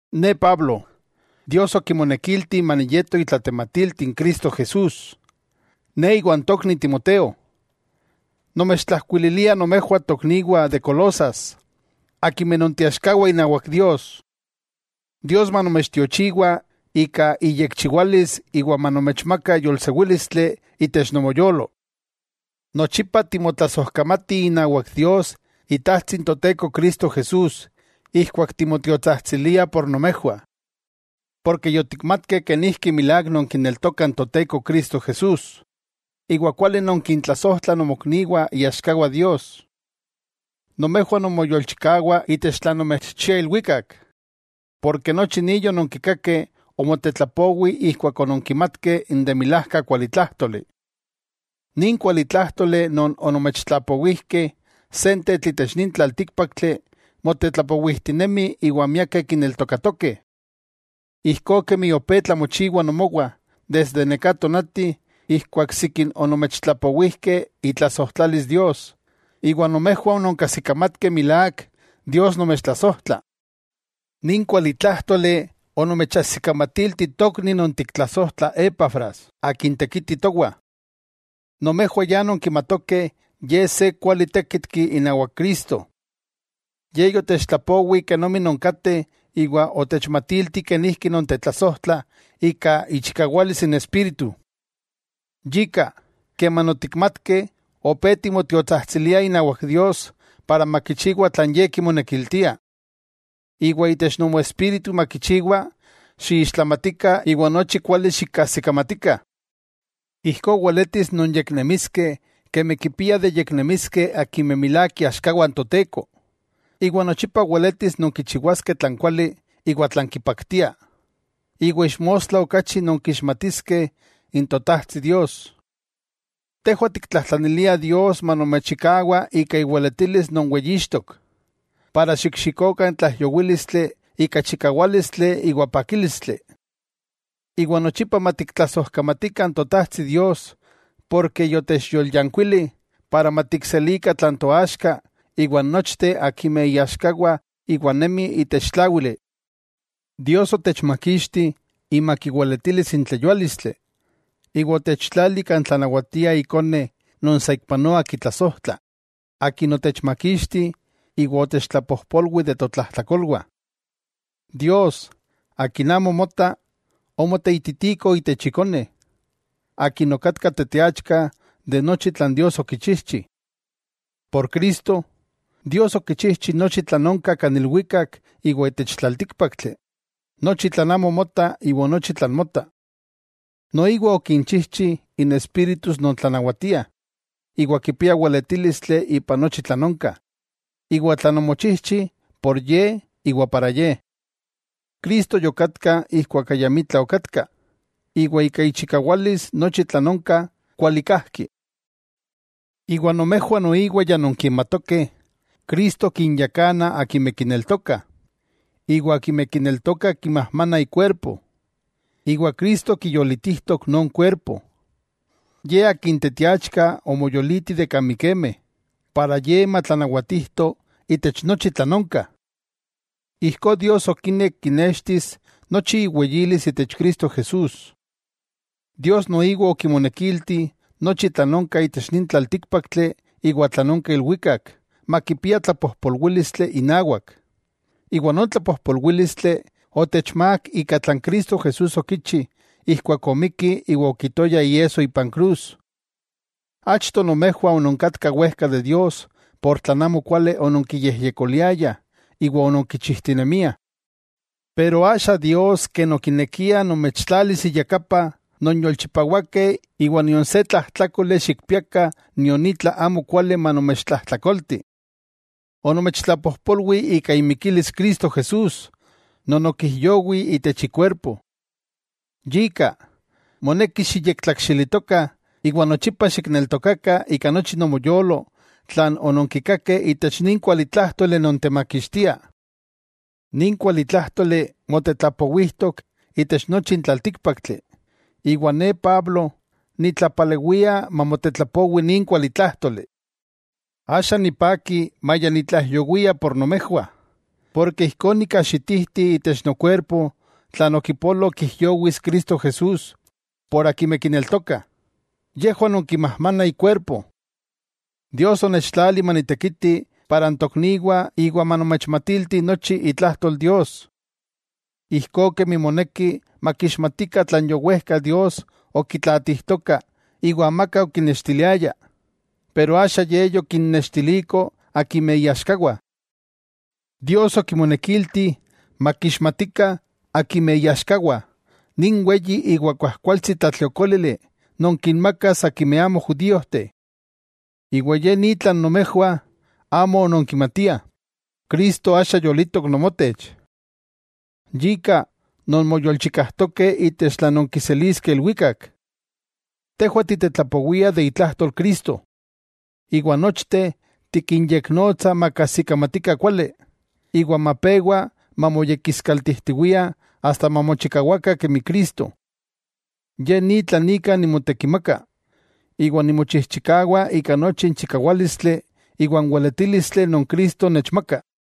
Ne Pablo, Dios okimonekilti maniyeto itlatematilti n Cristo Jesús. Ne iwa n tokni Timoteo, nomechtlajkuililiah nomejwah tokniwah de Colosas akimeh nonteaxkawah inawak Dios: Dios manomechtiochiwa ika iyekchiwalis iwa manomechmaka yolsewílistli itech nomoyolo. Nochipa timotlasojkamatih inawak Dios Itajtsi n Toteko Cristo Jesús ijkuak timotiotsajtsiliah por nomejwah. Porke yotikmatkeh kenijki milák nonkineltokah n Toteko Cristo Jesús, iwa kuali nonkintlasojtlah nomokniwah iaxkawah Dios. Nomejwah nonmoyolchikawah itech tlan nomechchia ilwikak. Porke nochi ni yononkikakeh omotetlapowi ijkuak ononkimatkeh n de milajka kualitlájtoli. Nin kualitlájtoli non onomechtlapowijkeh, sentetl itech nin tlaltíkpaktli motetlapowijtinemi iwa miakeh kineltokatokeh. Ijkó kemi opé tlamochiwa nomowah desde neká tonati ijkuak sikin onomechtlapowijkeh itlasojtlalis Dios, iwa nomejwah ononkajsikamatkeh milák Dios nomechtlasojtla. Nin kualitlájtoli onomechajsikamatilti tokni non tiktlasojtlah Epafras akin tekiti towah. Nomejwah ya nonkimatokeh ye se kuali tékitki inawak Cristo. Ye yotechtlapowi kenomi nonkateh iwa otechmatilti kenijki nontetlasojtlah ika ichikawalis n Espíritu. Yika, keman otikmatkeh, opé timotiotsajtsiliah inawak Dios para makichiwa tlan Ye kimonekiltia. Iwa itech nomoespíritu makichiwa xiixtlamatikah iwa nochi kuali xikajsikamatikah. Ijkó weletis nonyeknemiskeh kemi kipiah de yeknemiskeh akimeh milák iaxkawah n Toteko, iwa nochipa weletis nonkichiwaskeh tlan kuali iwa tlan kipaktia, iwa ixmostla okachi nonkixmatiskeh n Totajtsi Dios. Tejwah tiktlajtlaniliah Dios manomechchikawa ika iweletilis non weyixtok, para xikxikokah n tlaijyowílistli ika chikawálistli iwa pakílistli, iwa nochipa matiktlasojkamatikah n Totajtsi Dios porke yotechyolyankuili para matikselikah tlan toaxka iwa n nochteh akimeh iaxkawah iwa nemih itech tláwili. Dios otechmakixti imak iweletilis n tleyuálistli, iwa otechtlali kan tlanawatia Ikone non saikpanoa kitlasojtla, Akin otechmakixti, iwa otechtlapojpolwi de totlajtlakolwah. Dios, Akin amo mota, omoteititiko itech Ikone, Akin okatka teteachka de nochi tlan Dios okichijchi. Por Cristo, Dios okichijchi nochi tlan onka kan ilwikak iwa itech tlaltíkpaktli, nochi tlan amo mota iwa nochi tlan mota. Noiwa okinchijchi n espíritus non tlanawatiah, iwa kipiah weletílistli ipan nochi tlan onka, iwa tlan omochijchi por Ye iwa para Ye. Cristo yokatka ijkuak ayamitla okatka, iwa ika ichikawalis nochi tlan onka kuali kajki. Iwa nomejwah noiwa ya nonkimatokeh Cristo kinyakana akimeh kineltokah, iwa akimeh kineltokah kimajmanah ikuerpo. Iwa Cristo kiyolitijtok non kuerpo, Ye Akin tetiachka omoyoliti de kan mikemeh, para Ye matlanawatijto itech nochi tlan onka. Ijkó Dios okinek kinextis nochi iweyilis itech Cristo Jesús, Dios noiwa okimonekilti nochi tlan onka itech nin tlaltíkpaktli iwa tlan onka ilwikak makipia tlapojpolwílistli inawak, iwa non tlapojpolwílistli otechmák ika tlan Cristo Jesús okichi ijkuak omikki iwa okitoya iesso ipan krus. Achto, nomejwah ononkatkah wejka de Dios por tlan amo kuali ononkiyejyekoliayah iwa ononkichijtinemiah. Pero axa Dios ken okinekia nomechtlalis iyakapa nonyolchipawakeh iwa nion se tlajtlákoli xikpiakah nion itla amo kuali manomechtlajtlakolti. Onomechtlapojpolwi ika imikilis Cristo Jesús non okijyowi itech ikuerpo. Yika, moneki xiyektlakxilitokah iwa nochipa xikneltokakah ika nochi nomoyolo tlan ononkikakeh itech nin kualitlájtoli non temakixtia. Nin kualitlájtoli motetlapowijtok itech nochi n tlaltíkpaktli, iwa ne Pablo, nitlapalewia mamotetlapowi nin kualitlájtoli. Axa nipaki maya nitlaijyowia por nomejwah, porke ijkó nikajxitijti itech nokuerpo tlan okipolo kijyowis Cristo Jesús por akimeh kineltokah, yejwah non kimajmanah ikuerpo. Dios onechtlali manitekiti para n tokniwah iwa manomechmatilti nochi itlajtol Dios. Ijkó kemi moneki makixmatikah tlan yowejka Dios okitlaatijtoka iwa amaka okinextiliaya, pero axa Ye yokinnextiliko akimeh iaxkawah. Dios okimonekilti makixmatikah akimeh iaxkawah nin weyi iwa kuajkualtsi tlatliokólili non kinmakas akimeh amo judíojteh. Iwa ye ni tlan nomejwah amo ononkimatiah, Cristo axa yolitok nomotech. Yika nonmoyolchikajtokeh itech tlan nonkiseliskeh ilwikak. Tejwah titetlapowiah de itlajtol Cristo, iwa nochteh tikinyeknonotsah makajsikamatikah kuali, iwa mapewa mamoyekiskaltijtiwiah asta mamochikawakah kemi Cristo. Ye ni tlan ika nimotekimaka, iwa nimochijchikawa ika nochi n chikawálistli iwa n weletílistli non Cristo nechmaka.